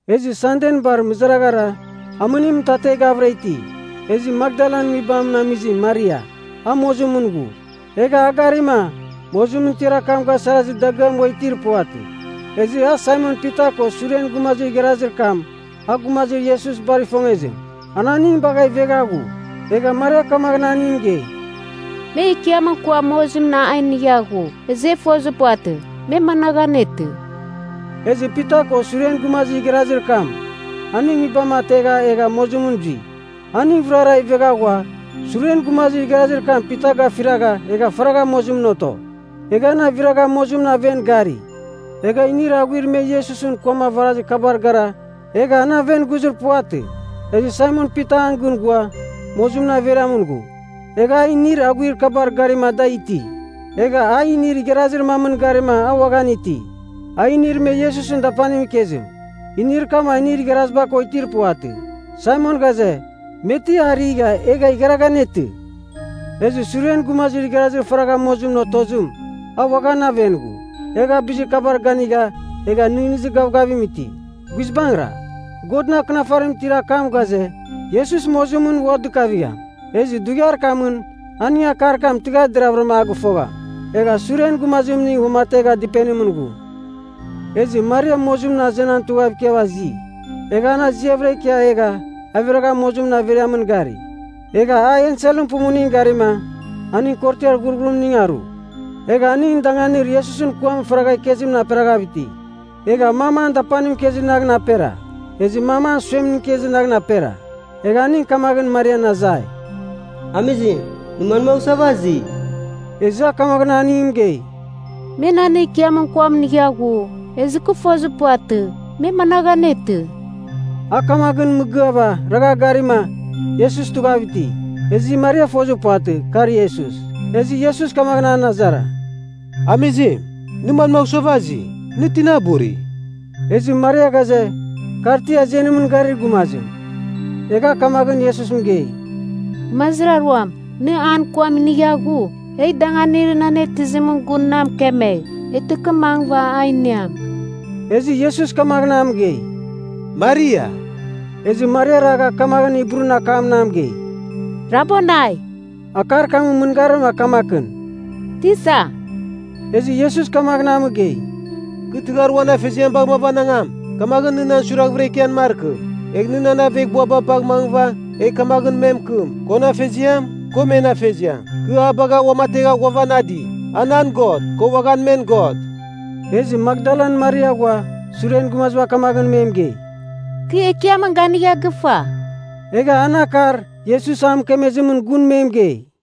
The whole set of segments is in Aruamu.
Ezɨ Sanden bar mɨzaraghara, amɨnim mɨtateghavɨra iti, ezɨ Makdalan nguibamɨn amizim Maria, a mozimɨn ghu. Egha a garima mozimɨn tiar akam gasarazir dagɨam ua itir puvatɨ. Ezɨ a, Saimon Pita ko suren gumazir igharazir kam, a gumazir Iesus bar ifongezim, an aning bagha ivegha ghu. Egha Maria kamaghɨn aningɨn mɨgei, “Me Ekiamɨn kuam mozimɨn a inigha ghu, ezɨ e fozir puvatɨ, me managh anetɨ.” Ezɨ Pita ko suren gumazir igharazir kam, aning nguibam ategha egha mozimɨn zui. Aning vɨrara ivegha ghua, suren gumazir igharazir kam Pita gafiragha, egha faragha mozimɨn oto. Egha an aviragha mozimɨn aven gari, egha inir aghuir me Iesusɨn kuam avarazir kabar gara egha an aven ghuzir puvatɨ. Ezɨ Saimon Pita an gɨn ghua, mozimɨn averiamɨn ghu. Egha a inir aghuir kabar garima da iti. Egha a inir igharazir mamɨn garima a uaghan iti, a inir me Iesusɨn dapanimɨn ikezim. Inir kam a inir igharaziba ko itir puvatɨ. Saimon ghaze, me ti a righa egha igharagha anetɨ. Ezɨ suren gumazir igharazir faragha mozimɨn otozim, a uaghan aven ghu. Egha a bizir kabar ganigha egha nɨghnɨzir gavgavim iti. (Guizbangɨra, Godɨn Akɨnafarimɨn itir akam ghaze, Iesus mozimɨn ua dɨkavigham. Ezɨ dughiar kamɨn aning akar kam tɨghar deraghvɨra a gɨfogham.) Egha suren gumazimning uamategha dɨpenimɨn ghu. Ezɨ Maria mozimɨn azenan tughav ikia azi. Egha an aziavɨra ikia egha aviragha mozimɨn averiamɨn gari. Egha a enselɨn pumuningɨn garima, aning korotiar ghurghurimning aru. Egha aning danganir Iesusɨn kuam faragha ikezimɨn aperaghav iti. Egha mam an dapanim ikezir naghɨn apera ezɨ mam an suemning ikezir naghɨn apera. Egha aning kamaghɨn Marian azai, “Amizim, nɨ manmagh suava azi?” Ezɨ a kamaghɨn aningɨn mɨgei, “Me nan Ekiamɨn kuam inigha ghu, ezɨ kɨ fozir puvatɨ, me managh anetɨ.” A kamaghɨn mɨgɨava, ragha garima, Iesus tughav iti. Ezɨ Maria fozir puvatɨ, ka Iesus. Ezɨ Iesus kamaghɨn an azara, “Amizim, nɨ manmagh suava azi? Nɨ tina buri?” Ezɨ Maria ghaze, kar ti azenimɨn garir gumazim, egha a kamaghɨn Iesus mɨgei, “Gumazir aruam, nɨ an kuam inigha ghu, egh danganir nɨ an atɨzimɨn gun na mɨkemegh. Eghtɨ kɨ mangɨva a iniam.” Ezɨ Iesus kamaghɨn a mɨgei, “Maria!” Ezɨ Maria ragha kamaghɨn Hibrun akamɨn a mɨgei, “Rabonai.” Akar kamɨn mɨngarim a kamakɨn, “Tisa.” Ezɨ Iesus kamaghɨn a mɨgei, “Kɨ tɨghar uan Afeziam bagh mavanangam, kamaghɨn nɨ nan suiraghvɨra ikian markɨ. Egh nɨ nan aveghbuaba bagh mangɨva egh kamaghɨn me mɨkɨm, kon Afeziam, ko men Afeziam, kɨ a bagha uamategha ghuavanadi. A nan God, ko uaghan men God.” Ezɨ Makdalan Maria ghua suren gumaziba kamaghɨn me mɨgei, “Kɨ Ekiamɨn ganigha gɨfa.” Egha an akar Iesus a mɨkemezimɨn gun me mɨgei.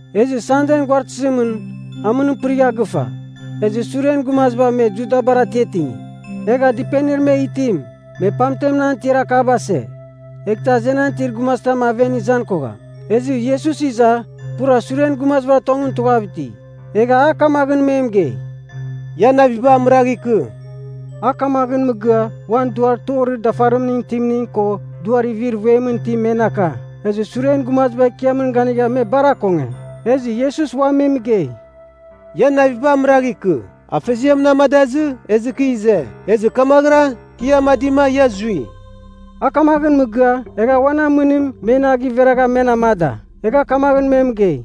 Ezɨ Sanden guaratɨzimɨn amɨnim pɨrigha gɨfa. Ezɨ suren gumaziba me Judabar atiatingi, egha dɨpenir me itim, me pamten an tiar akaba ase, eghtɨ azenan itir gumazitam aven izan kogham. Ezɨ Iesus iza pura suren gumazibar tongɨn tughav iti. Egha a kamaghɨn me mɨgei, “Ian naviba amɨragh ikɨ.” A kamaghɨn mɨgɨa, uan duar torir dafarimningɨn itimning ko duar ivir vuemɨn itim, men aka. Ezɨ suren gumaziba Ekiamɨn ganigha me bar akonge. Ezɨ Iesus ua me mɨgei, “Ian naviba amɨragh ikɨ. Afeziam na amadazɨ ezɨ kɨ ize. Ezɨ kamaghɨra kɨ ia amadima ia zui.” A kamaghɨn mɨgɨa, egha uan amɨnim men a giveragha men amada, egha kamaghɨn me mɨgei,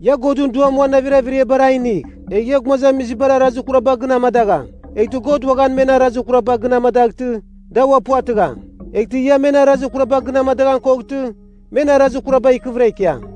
“Ia Godɨn Duam uan navir averiabar a inigh. Egh ia gumazamizibar arazir kuraba gɨn amadagham, eghtɨ God uaghan men arazir kuraba gɨn amadaghtɨ, da ua puvatɨgham. Eghtɨ ia men arazir kuraba gɨn amadaghan koghtɨ, men arazir kuraba ikɨvɨra ikiam.”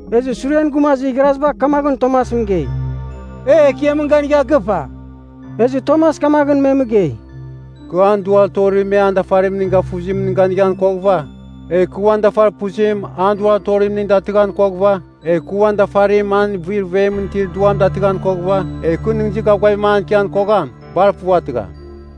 Ezɨ suren gumazir igharaziba kamaghɨn Tomas mɨgei, “E Ekiamɨn ganigha gɨfa.” Ezɨ Tomas kamaghɨn me mɨgei, “Kɨ an duar torir me an dafarimning gafuzimingɨn ganighan koghɨva, egh kɨ uan dafarpuzim an duar torimning datɨghan koghɨva, egh kɨ uan dafarim an ivir vuemɨn itir duam datɨghan koghɨva, egh kɨ nɨghnɨzir gavgavim ikian kogham. Bar puvatɨgham.”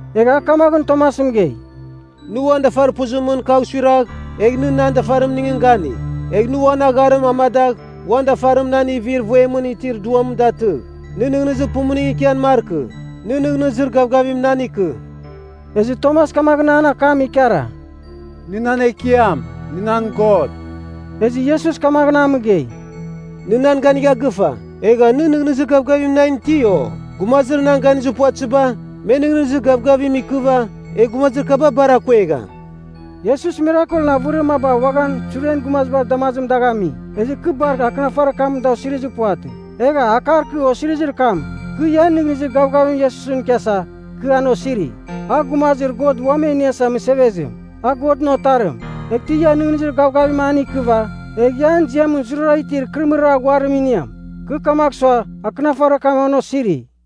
Egha a kamaghɨn Tomas mɨgei, “Nɨ uan dafarpuzimɨn kagh suiragh, egh nɨ nan dafarimningɨn ganigh. Egh nɨ uan agharim amadagh uan dafarim nan ivir vuemɨn itir duam datɨgh. Nɨ nɨghnɨzir pumuning ikian markɨ. Nɨ nɨghnɨzir gavgavim nan ikɨ.” Ezɨ Tomas kamaghɨn an akam ikara, “Nɨ nan Ekiam. Nɨ nan God.” Ezɨ Iesus kamaghɨn a mɨgei, “Nɨ nan ganigha gɨfa, egha nɨ nɨghnɨzir gavgavim nan iti, o? Gumazir na ganizir puvatɨziba, me nɨghnɨzir gavgavim ikɨva, egh gumazir kaba bar akuegham.” Iesus mirakelɨn avɨrir maba uaghan suren gumazibar damazimɨn dagh ami. Ezɨ kɨ bar Akɨnafarir kamɨn da osirizir puvatɨ. Egha, akar kɨ osirizir kam, kɨ ia nɨghnɨzir gavgavim Iesusɨn ikiasa, kɨ an osiri. A Gumazir God Uam E Iniasa Mɨsevezim, a Godɨn Otarim. Eghtɨ ia nɨghnɨzir gavgavim an ikɨva, egh ia an ziamɨn zurara itir ikɨrɨmɨrir aghuarim iniam. Kɨ kamagh sua, akɨnafarir kam an osiri.